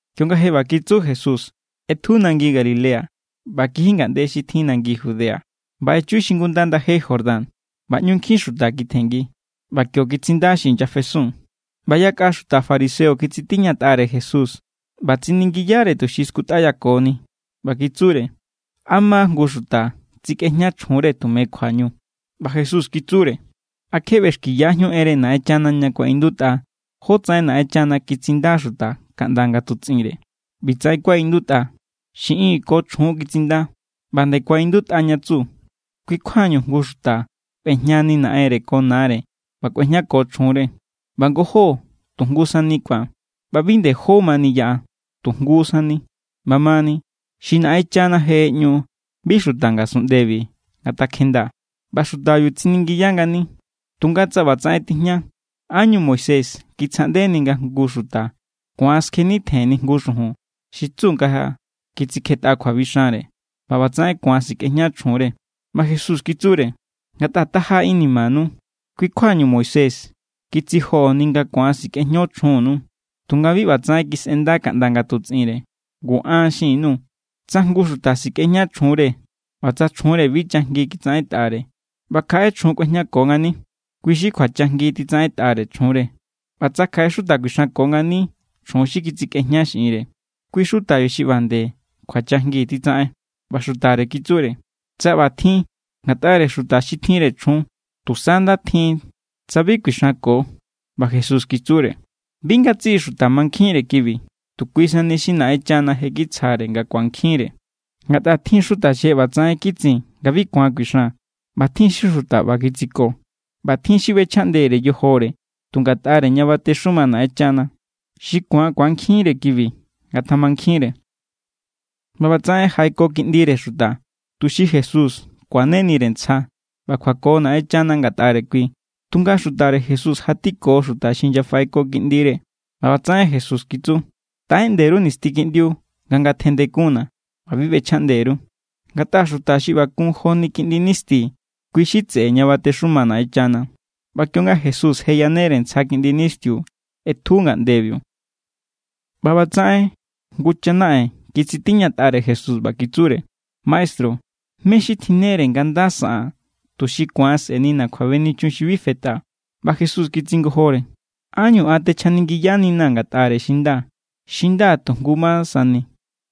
Kionga je ꞌba kitsu Jesús, ꞌetju nangi Galilea ꞌba kiji ngaꞌnde xi tjin nangi Judea, ꞌba echu xingunda ndaje Jordán. ꞌBa ꞌñu nkjin xuta kitjenngi, ꞌba kio kitsinda xi inyafesun. ꞌBa yakꞌa xuta fariseo kitsitiñatꞌare Jesús, ꞌba tsiningiyare tuxi skutꞌayakoni, ꞌba kitsure: —¿A ma jngu xuta tsikꞌejña chjunre tume kjuañu? ꞌBa Jesús kitsure: —¿A kje ꞌbexkiyajíun enre Naꞌenchana ña kuaꞌindutꞌa jotsaꞌen Naꞌenchana kitsinda xuta kaꞌnda nga tutsꞌinre? ꞌBi tsaꞌen kuaꞌindutꞌa: “Xiꞌin ko chjun kitsinda.” ꞌBa nde kuaꞌindutꞌa ña kitsu: “Kui= kjuañu jngu xuta kꞌuejñani naꞌenre ko nare ꞌba kꞌuejñako chjunre. ꞌBa ngojó tu jngu sani ku̱an.” ꞌBa bi nde jó mani yaꞌa, tu jngu sani. ꞌBamani, xi Naꞌenchana je ꞌeꞌñu, bi xuta ngasunꞌndebi ngatakjejnda. ꞌBa xutabiu tsiningiya ngani: —Tunga tsa ꞌbatsaꞌen tijña, ¿ánñu Moisés kitsjaꞌndeni nga jngu xuta ku̱an skjenitjenni jngu xujun xi tsu nga kitsikjetꞌa kjuabixanre, ꞌba ꞌbatsaꞌen ku̱an sikꞌejña chjunre? ꞌBa Jesús kitsure: —Ngatꞌa taja= inimanu, kui= kjuañu Moisés kitsijoꞌoni nga ku̱an sikꞌejño chjunnu. Tunga bi ꞌba tsaꞌen kisꞌenda kaꞌnda nga tutsꞌinre. Ngu an xin_nuu̱. Tsa jngu xuta sikꞌejña chjunre ꞌba tsa chjunre bi chajngi kitsaꞌentꞌare, ꞌba kjaꞌe chjun kꞌuejñako ngani, kui= xi kjuachajngi titsaꞌentꞌare chjunre. ꞌBa tsa kjaꞌe xuta kuixanko ngani chjun xi kitsikꞌejña xiꞌinre, kui xutabiu xi ꞌba nde kjuachajngi titsaꞌen. ꞌBa xutare kitsure: —Tsa ꞌbatjin ngatꞌare xuta xi tjinre chjun, tusa nda tjin tsa bi kuixanko. ꞌBa Jesús kitsure: —Bi ngatsiꞌi xuta mankjinre kibi, tu kui sani xi Naꞌenchana je kitsjare nga ku̱ankjinre. Ngatꞌa tjin= xuta xi je ꞌbatsaꞌen kitsin nga bi ku̱an kuixan. ꞌBa tjin= xi xuta ꞌba kitsiko. ꞌBa tjin= xi ꞌbechjaꞌndere yojore tu ngatꞌare ña batexuma Naꞌenchana. Xi ku̱an ku̱ankjinre kibi, ngatamankjinre. ꞌBa ꞌbatsaꞌen jaꞌeko kiꞌndire xuta, tuxi Jesús kuanenire ntsja ꞌba kjuako Naꞌenchana ngatꞌare kui, tunga xutare Jesús jatiko xuta xi inyafaꞌeko kiꞌndire. ꞌBa ꞌbatsaꞌen Jesús kitsu: —Taꞌeꞌnde_ru nisti kiꞌndiu nga ngatjendekunna̱, ꞌba bi ꞌbechjaꞌnde_ru. Ngatꞌa xuta xi ꞌba kun joni kiꞌndi nisti, kui= xi tseꞌe ña batexuma Naꞌenchana. ꞌBa kionga Jesús je yanere ntsja kiꞌndi nistiu, ꞌetju ngaꞌndebiu. ꞌBa ꞌbatsaꞌen jngu chanaꞌen kitsitiñatꞌare Jesús, ꞌba kitsure: —Maestru, ¿mé= xi tjinnere nga nda saꞌaa̱n, tuxi ku̱an sꞌe̱nina̱ kjuabenichun xi bi fetꞌa? ꞌBa Jesús kitsingojore: —¿Ánñu an techjaningiyaninaa̱ ngatꞌare xi nda? Xi nda tu jngu ma sani.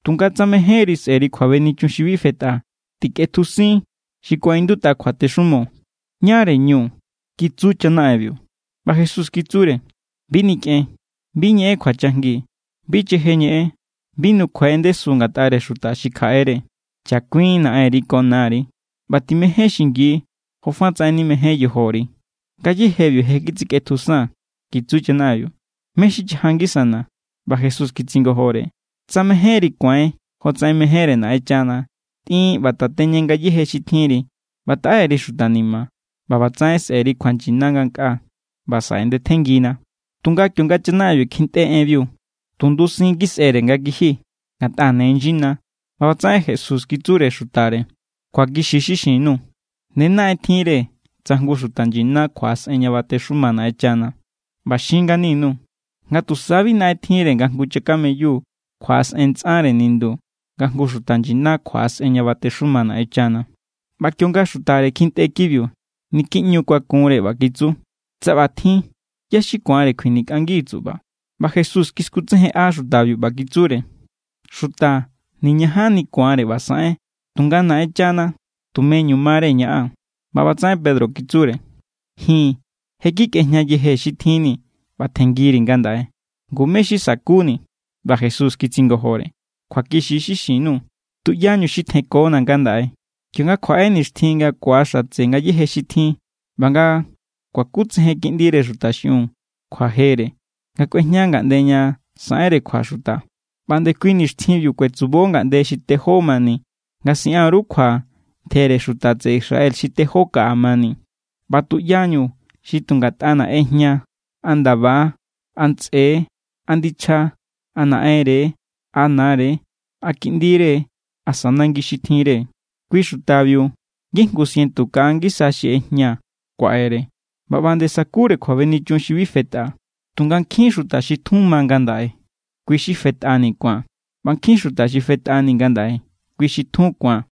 Tunga tsa mejénri sꞌe̱ri kjuabenichun xi bi fetꞌa, tikꞌetjusin xi kuaꞌindutꞌa kjuatexumo. —¿Ñáre ñu? —kitsu chanaꞌenbiu. ꞌBa Jesús kitsure: —Bi nikꞌen. Bi ñeꞌen kjuachajngi. Bi cheje ñeꞌen. Bi nukjuai en ndesu ngatꞌare xuta xi kjaꞌere. Chakuin naꞌenri ko nari. ꞌBa timején xingi jofatsaꞌen nimején yojori. —Ngayéjebiu je kitsikꞌetjusaa̱n —kitsu chanaꞌenbiu—. ¿Mé= xi chaja ngisana̱? ꞌBa Jesús kitsingojore: —Tsa mejénri ku̱ain jotsaꞌen mejénre Naꞌenchana, tꞌin ꞌba tateñe ngayéje xi tjinri ꞌba taꞌe_ri xuta ni̱ma̱, ꞌba ꞌbatsaꞌen sꞌe̱ri kjuanyina ngankꞌaa. ꞌBa saꞌe ndetjenngina. Tunga kionga chanaꞌenbiu kjintꞌe enbiu, tu ndusin kisꞌere nga kiji, ngatꞌa ne nyina. ꞌBa ꞌbatsaꞌen Jesús kitsure xutare: —Kjuakixi= xi xin_nuu̱. Ne naꞌen tjinre tsa jngu xuta nyina kjuaꞌasꞌen ña batexuma Naꞌenchana. ꞌBa xin ngani_nuu̱ nga tusa bi naꞌen tjinre nga jngu chakameyu kjuaꞌasꞌen ntsꞌanre nindu, nga jngu xuta nyina kjuaꞌasꞌen ña batexuma Naꞌenchana. ꞌBa kionga xutare kjintꞌe kibiu, niki ꞌñu= kuakunre, ꞌba kitsu: —Tsa ꞌbatjin, ¿ꞌyá= xi ku̱anre kjuinikꞌangi tsuꞌba? ꞌBa Jesús kiskutsejenꞌa xutabiu, ꞌba kitsure: —Xuta niñajanni ku̱anre ꞌba saꞌen, tunga Naꞌenchana tumeñu mare ñaꞌan. ꞌBa ꞌbatsaꞌen Pedro kitsure: —Ji̱n je kikꞌejña yejee̱ xi tjinni̱ ꞌba tjenngiri ngandaꞌe. Ngu, ¿mé= xi sakuni̱? ꞌBa Jesús kitsingojore: —Kjuakixi= xi xin_nuu̱. Tuꞌyañu xi tjenkona̱ ngandaꞌe, kionga kjuaꞌe nixtjin nga ku̱axatse ngayéje xi tjin ꞌba nga kuakutsejen Kiꞌndire Xuta xiꞌiun kjuajere nga kꞌuejña ngaꞌnde ña saꞌenre kjua xuta, ꞌba nde kui nixtjinbiu kuetsubo ngaꞌnde xi tejó mani nga siꞌan_ru kjua ntjere xuta tseꞌe Israel xi tejó kaꞌa mani. ꞌBa tuꞌyañu xi tu ngatꞌana̱ ꞌejña a ndaba= a ntsꞌe= a ndichja= a naꞌenre= a nare= a kiꞌndire asa nangi xi tjinre, kui xutabiu ngijngu sientu kaꞌa ngisa xi ꞌejña kuaꞌere, ꞌba ꞌba nde sakure kjuabenichun xi bi fetꞌa. Tunga nkjin= xuta xi tjun ma ngandaꞌe, kui= xi fetꞌani ku̱an. ꞌBa nkjin= xuta xi fetꞌani ngandaꞌe, kui= xi tjun ku̱an.